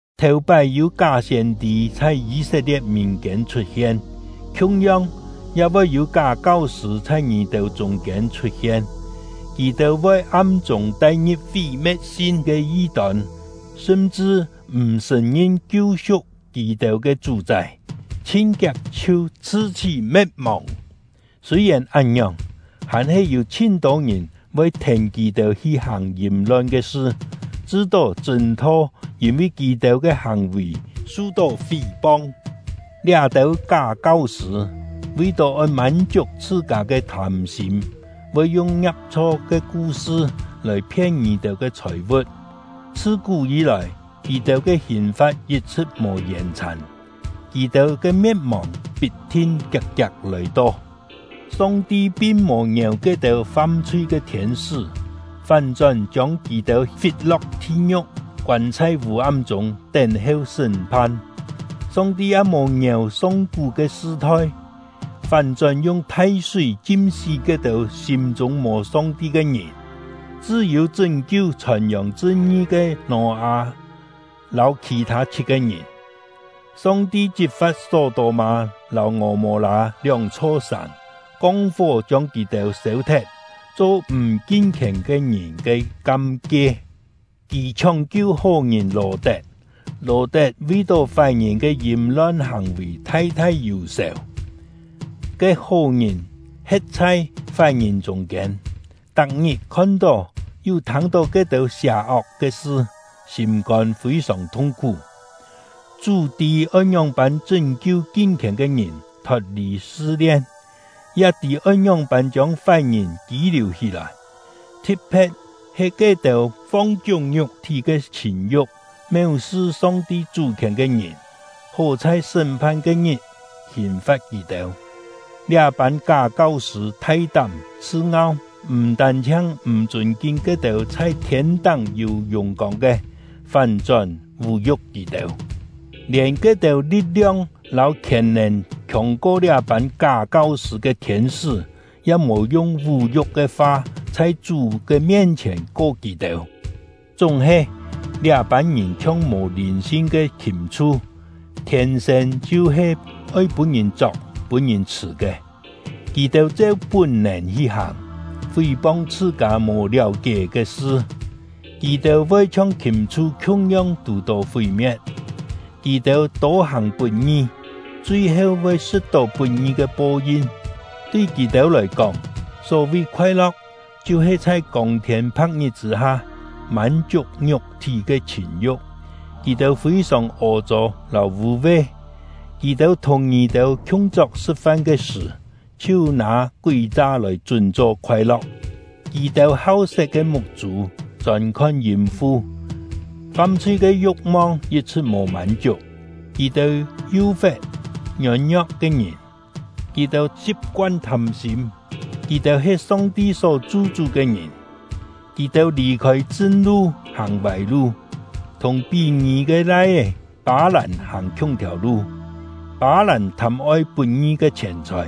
Thèu-pái yû ká siên-tî chhai Yî-set-lie̍t mìn-kiên chhut-hien; khiung-yong, ya voi yû ká kau-sṳ̂ chhai ngì-têu chûng-kiên chhut-hien. Kì-têu voi am-chûng tai-ngi̍p fí-me̍t-sin ke yi-tôn, sṳm-chṳ m̀ sṳ̀n-ngin kiu-su̍k kì-têu ke Chú-chái, chhin-kiak chhiu chhṳ-chhí me̍t-mòng. Sûi-yèn án-ngiòng, hàn-he yû chhin-tô ngìn voi thèn kì-têu hi hàng yìm-lon ke sṳ, chṳ-to chṳ̂n-tho yîn-vi kì-têu ke hàng-vì su-tó fí-pong. Liá-têu ká kau-sṳ̂ vi-tó oi mân-chiuk chhṳ-kâ ke thâm-sîm, voi yung ngiap-chho ke ku-sṳ lòi phien ngì-têu ke chhòi-vu̍t. Chhṳ-kú yî-lòi, kì-têu ke hìn-fa̍t yit-chhṳ̍t mò yèn-chhàn; kì-têu ke me̍t-mòng pit-thin kiak-kiak lòi-to! Song-ti pin mò ngièu ke-têu fam-chhui ke thiên-sṳ́, fán-chón chiông kì-têu fit-lo̍k thi-ngiu̍k, koân chhai vû-am chûng, tén-heu sṳ́m-phan. Song-ti ya mò ngièu song-kú ke sṳ-thoi, fán-chón yung thai-súi chim-sí ke-têu sîm-chûng mò Song-ti ke ngìn, chṳ́-yû chṳ́n-kiu chhòn-yòng chṳn-ngi ke Nò-â lâu khì-thâ chhit-ke ngìn. Song-ti chit-fa̍t Só-tô-mâ lâu Ngò-mô-lâ lióng-chho sàng, kong fó chiông kì-têu sêu-thet, cho m̀ kin-khièn ke ngìn ke kam-kie. Kì chhióng-kiu hó-ngìn Lò-tet; Lò-tet vi-tó fái-ngìn ke yìm-lon hàng-vì thai-thai yù-sèu. Ke hó-ngìn he̍t chhai fái-ngìn chûng-kiên, tak-ngit khon-tó yu thâng-tó ke-têu sià-ok ke sṳ, sîm-kôn fî-sòng thung-khú. Chú tî oi ngióng-pân chṳ́n-kiu kin-khièn ke ngìn thot-lì sṳ-lien, ya tî oi ngióng-pân chiông fái-ngìn kî-liù hí-lòi, thi̍t-phe̍t he ke-têu fong-chiúng ngiuk-thí ke chhìn-yu̍k, méu-sṳ Song-ti Chú-khièn ke ngìn, hó chhai sṳ́m-phan ke-ngit hìn-fa̍t kì-têu. Liá-pân ká kau-sṳ̂ thai-tám, chhṳ-ngau, m̀ tân-chhiang m̀ chûn-kin ke-têu chhai thiên-táng yû yùng-kông ke, fán-chón vú-yu̍k kì-têu; lièn ke-têu li̍t-liong lâu khièn-nèn khiòng-ko liá-pân ká kau-sṳ̂ ke thiên-sṳ́ ya mò yung vú-yu̍k ke fa chhai Chú ke mien-chhièn ko kì-têu. Chúng-he, liá-pân ngìn chhiong mò lìn-sin ke khìm-chhu, thiên-sên chhiu-he oi pûn-ngìn chok pûn-ngìn chhṳ̀ ke; kì-têu cheu pún-nèn hi hàng, fí-pong chhṳ-kâ mò liáu-kié ke sṳ. Kì-têu voi chhiong khìm-chhu khiung-yong tù-tó fí-me̍t. Kì-têu tô hàng put-ngi, chui-heu voi sṳ̍t-tó put-ngi ke po-yin. Tui kì-têu lòi kóng, só-vi khoai-lo̍k chhiu-he chhai kông-thiên pha̍k-ngit chṳ̂-ha mân-chiuk ngiuk-thí ke chhìn-yu̍k. Kì-têu fî-sòng ô-chô lâu vû-ve! Kì-têu thùng ngì-têu khiung-chok sṳ̍t-fan “khiung-chok sṳ̍t-fan” yû-têu kú-kién he “chhai oi-yen”. ke sṳ̀, chhiu nâ kúi-cha lòi chún-cho khoai-lo̍k! Kì-têu hau-set ke muk-chû chôn-khon yìm-fu, fam-chhui ke yu̍k-mong yit-chhṳ̍t mò mân-chiuk. Kì-têu yú-fe̍t ngiôn-ngio̍k ke ngìn; kì-têu si̍p-koan thâm-sîm; kì-têu he Song-ti só chu-chú ke ngìn! Kì-têu lì-khôi chṳn-lu, hàng vâi-lu, thùng Pí-ngí ke lai-é Pâ-làn hàng khiung-thiàu lu. Pâ-làn thâm-oi put-ngi ke chhièn-chhòi;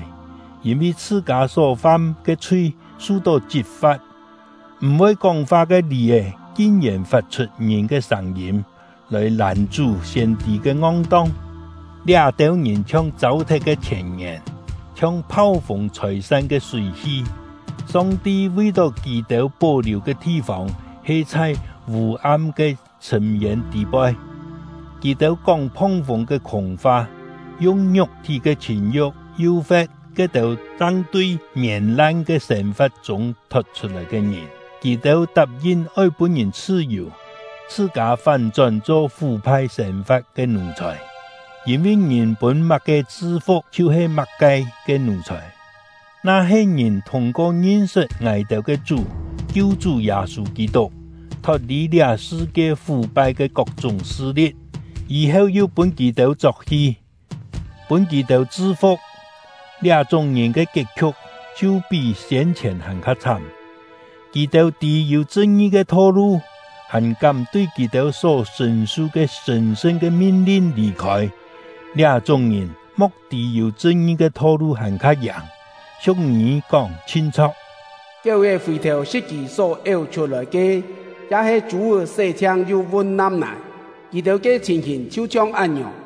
yîn-vi chhṳ-kâ só-fam ke chhui su-tó chit-fa̍t. M̀-voi kóng-fa ke lì-è kin-yèn fat-chhut ngìn ke sâng-yîm lòi làn-chú siên-tî ke ngong-tong. Liá-têu ngìn chhiong châu-thet ke chhièn-ngièn, chhiong phau-fûng chhôi-san ke súi-hi; Song-ti vi-tó kì-têu pó-liù ke thi-fông he chhai vû-am ke chhṳ̂m-yên tî-poi. Kì-têu kóng phong-fûng ke khûng-fa, yung ngiuk-thí ke chhìn-yu̍k yú-fe̍t ke-têu chang tui mièn-lan ke sên-fa̍t chûng thot-chhut-lòi ke ngìn. Kì-têu tap-yin oi pûn ngìn chhṳ-yù, chhṳ-kâ fán-chón cho fú-phai sên-fa̍t ke nù-chhòi; yîn-vi ngìn pûn má-ke chṳ-fu̍k, chhiu-he má-ke ke nù-chhòi. Na-he ngìn thûng-ko ngin-sṳt ngài-têu ke Chú — Kiu-chú Yâ-sû Kî-tuk, thot-lì liá sṳ-kie fú-phai ke kok-chúng sṳ-li̍t, yî-heu yu pûn kì-têu chok-hi, pûn kì-têu chṳ-fu̍k, liá-chúng ngìn ke kiet-khiu̍k chhiu pí siên-chhièn hàn-kha chhám. Kì-têu tî yû chṳn-ngi ke tho-lu, hàn kám tui kì-têu só sṳ̀n-su ke sṳ̀n-sṳn ke min-lin lì-khôi; liá-chúng ngìn mo̍k tî yû chṳn-ngi ke tho-lu hàn-kha yàng. Siu̍k-ngî kóng chhin chho̍k: “Kiéu-è fì-thèu sṳ̍t kì só éu chhut-lòi ke”; ya-he “Chû-é sé-chhiang, yu vun nam-nài”. Kì-têu ke chhìn-hìn chhiu-chhiong án-ngiòng.